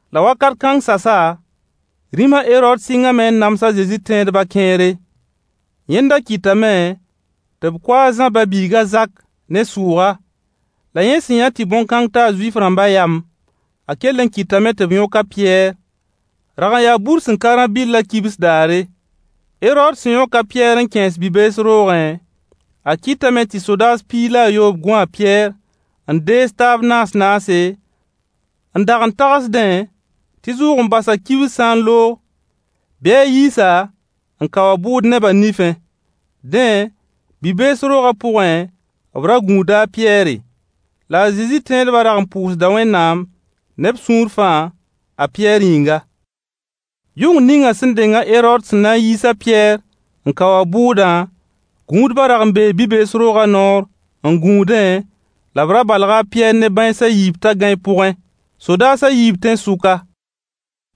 La wakat kãng sasa, rĩm a Herood sɩngame n nams a Zezi tẽedba kẽere. Yẽnda kɩtame tɩ b kʋ a Zã ba-biig a Zak ne sʋʋga. La yẽ sẽn yã tɩ bõn-kãng taa Zuif-rãmba yam, a kell n kɩtame tɩ b yõk a Pɩyɛɛr. Rag n yaa bur sẽn ka rã-bɩll kibs daare. Herood sẽn yõk a Pɩyɛɛr n kẽes bi-bees roogẽ, a kɩtame tɩ sodaas piig la a yoob gũ a Pɩyɛɛr n dees taab naas-naase, n dag n tagsdẽ tɩ zʋʋg-n-basã kibs sã n loog bɩ a yiis-a n kao a bʋʋd neba nifẽ. Dẽ, bi-bees roogã pʋgẽ b ra gũuda a Pɩyɛɛre. La a Zezi tẽedba rag n pʋʋsda Wẽnnaam ne b sũur fãa a Pɩyɛɛr yĩnga. Yʋng ninga sẽn deng a Herood sẽn na n yiis a Pɩyɛɛr n kao a bʋʋdã, gũudba rag n bee bi-bees rooga noor n gũudẽ la b ra balga a Pɩyɛɛr ne bãens a yiib t'a gãe pʋgẽ. Sodaas a yiib tẽn-sʋka.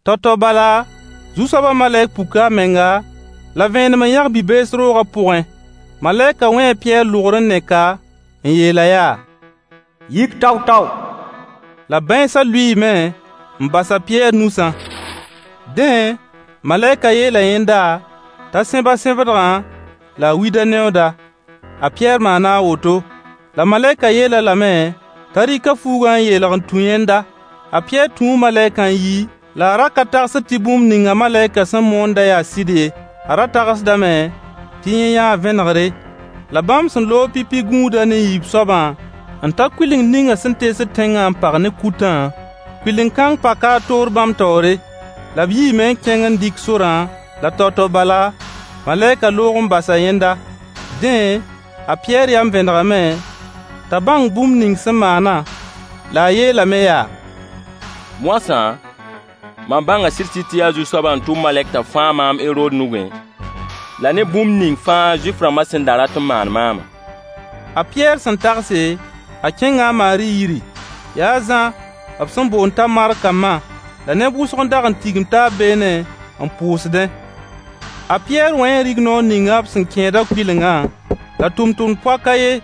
Tao-tao bala, Zu-soaba malɛk puka a menga la veenem n yãg bi-bees roogã pʋgẽ. Malɛkã wẽe a Pɩyɛɛr lʋgr n nek-a n yeel-a yaa: Yik tao-tao. La bãensa lʋɩɩme n bas a Pɩyɛɛr nusã. Dẽ, malɛka yeela a yẽnda t'a sẽb a sẽbdgã la a wid a neooda. A Pɩyɛɛr maana a woto. La malɛkã yeel-a lame t'a rɩk a fuugã n yeelg n tũ yẽnda. A Pɩyɛɛr tũu malɛkã n yi, la a ra ka tagsd tɩ bũmb ninga malɛkã sẽn moonda yaa sɩd ye. A ra tagsdame tɩ yẽ yãa vẽnegre. La bãmb sẽn loog pipi gũudã ne yiib soabã n ta kʋleng ninga sẽn teesd tẽngã n pag ne kutã, kʋɩlen-kãng paka a toor bãmb taoore. La b yiime n kẽng n dɩk sorã, la tao-tao bala, malɛkã loog n bas yẽnda. Dẽ, a Pɩyɛɛr yam vẽnegame t'a bãng bũmb ning sẽn maana. La a yeelame yaa: Moasã, mam bãnga sɩd-sɩd tɩ yaa Zu-soabã n tʋm malɛk t'a fãag maam Herood nugẽ la na bũmb ning fãa Zuif-rãmba sẽn da rat n maan maama. A Pɩyɛɛr sẽn tagse, a kẽnga a Maari yiri. Yaa a Zã b sẽn boond t'a markã ma. La neb wʋsg n dag n tigim taab beene n pʋʋsdẽ. A Pɩyɛɛr wẽe rignoor ninga b sẽn kẽeda kʋɩlengã, la tʋmtʋmd poak a yen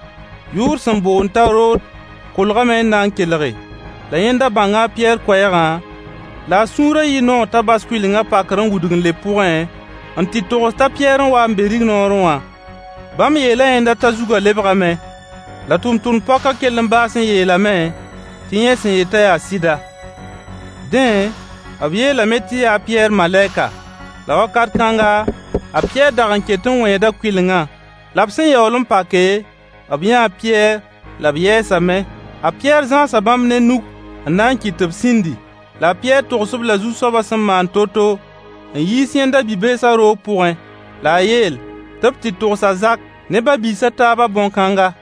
yʋʋr sẽn boond t'a Rood kolgame n na n kelge. La yẽnda bãnga a Pɩyɛɛr koɛɛgã la a sũurã yɩɩ noog t'a bas kʋɩlengã pakr n wudg n leb pʋgẽ n tɩ togs t'a Pɩyɛɛr n wa n be rignoorẽ wã. Bãmb yeela yẽnda t'a lebgame. La tʋmtʋmd-poakã kell n baas n yeelame tɩ yẽ sẽn yetã yaa sɩda. Dẽ, b yeelame tɩ yaa a Pɩyɛɛr malɛka. La wakat kãnga, a Pɩyɛɛr dag n ket wẽeda kʋɩlengã. La b sẽn yaool n pake, b yãa a Pɩyɛɛr la b yɛɛsame. A Pɩyɛɛr Zãasa bãmb ne nug n na n kɩt tɩ b sĩndi. La a Pɩyɛɛr togs-b-la Zu-soabã sẽn maan to-to n yiis yẽnda bi-beesa roog pʋgẽ. La a yeel tɩ b tɩ togs a zak ne ba-biis a taabã bõn-kãnga.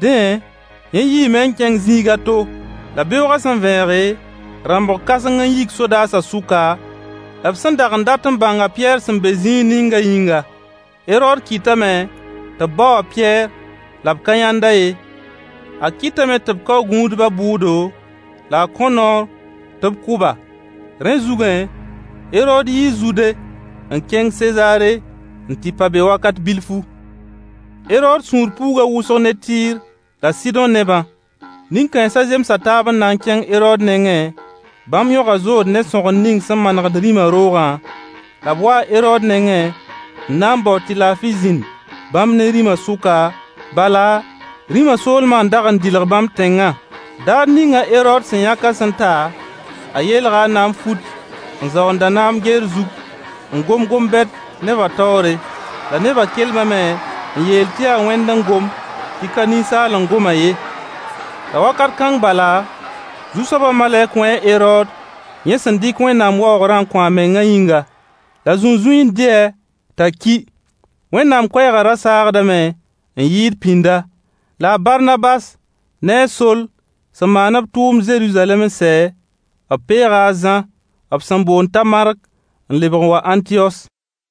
Dẽ, yẽ yiime n kẽng zĩig a to. La beoogã sẽn vẽege, rãmbg kãseng n yik sodaasã sʋka, b sẽn dag n dat n bãng a Pɩyɛɛr sẽn be zĩig ninga yĩnga. Herood kɩtame tɩ bao a Pɩyɛɛr, la b ka yãnd-a ye. A kɩtame tɩ b kao gũudba bʋʋdo, la a kõ noor tɩ b kʋ-ba. Rẽ zugẽ, Herood yii Zude n kẽng Sezaare n tɩ pa be wakat bilfu. Herood sũur puuga wʋsg ne Tɩɩr la Sɩdõ nebã. Nin-kãensa zemsa taab n na n kẽng Herood nengẽ bãmb yãga zood ne sõgen ning sẽn manegd rĩma roogã, la b waa Herood nengẽ n na n bao tɩ laafɩ zĩnd bãmb ne rĩma sʋka, sʋka, bala rĩma soolma n dag n dɩlg bãmb tẽngã. Daar ninga Herood sẽn yãkã sẽn ta, a yeelga a naam fut n zaoond a naam geer zug n gom gom-bɛd neba taoore. La neba kelmame n yeel tɩ yaa wẽnd n gom, tɩ ka ninsaal n goma ye. La wakat kãng bala, Zu-soaba malɛk wẽe Herood yẽ sẽn dɩk Wẽnnaam waoogrã n kõ a mengã yĩnga. La zũnzũi n dɩ-a t'a ki. Wẽnnaam koɛɛga ra saagdame n yɩɩd pĩnda. La Barnabas ne a Soll sẽn maan b tʋʋmd Zeruzalɛm n sɛ, b peega a Zã b sẽn boond t'a Mark n lebg n wa Ãntiyos.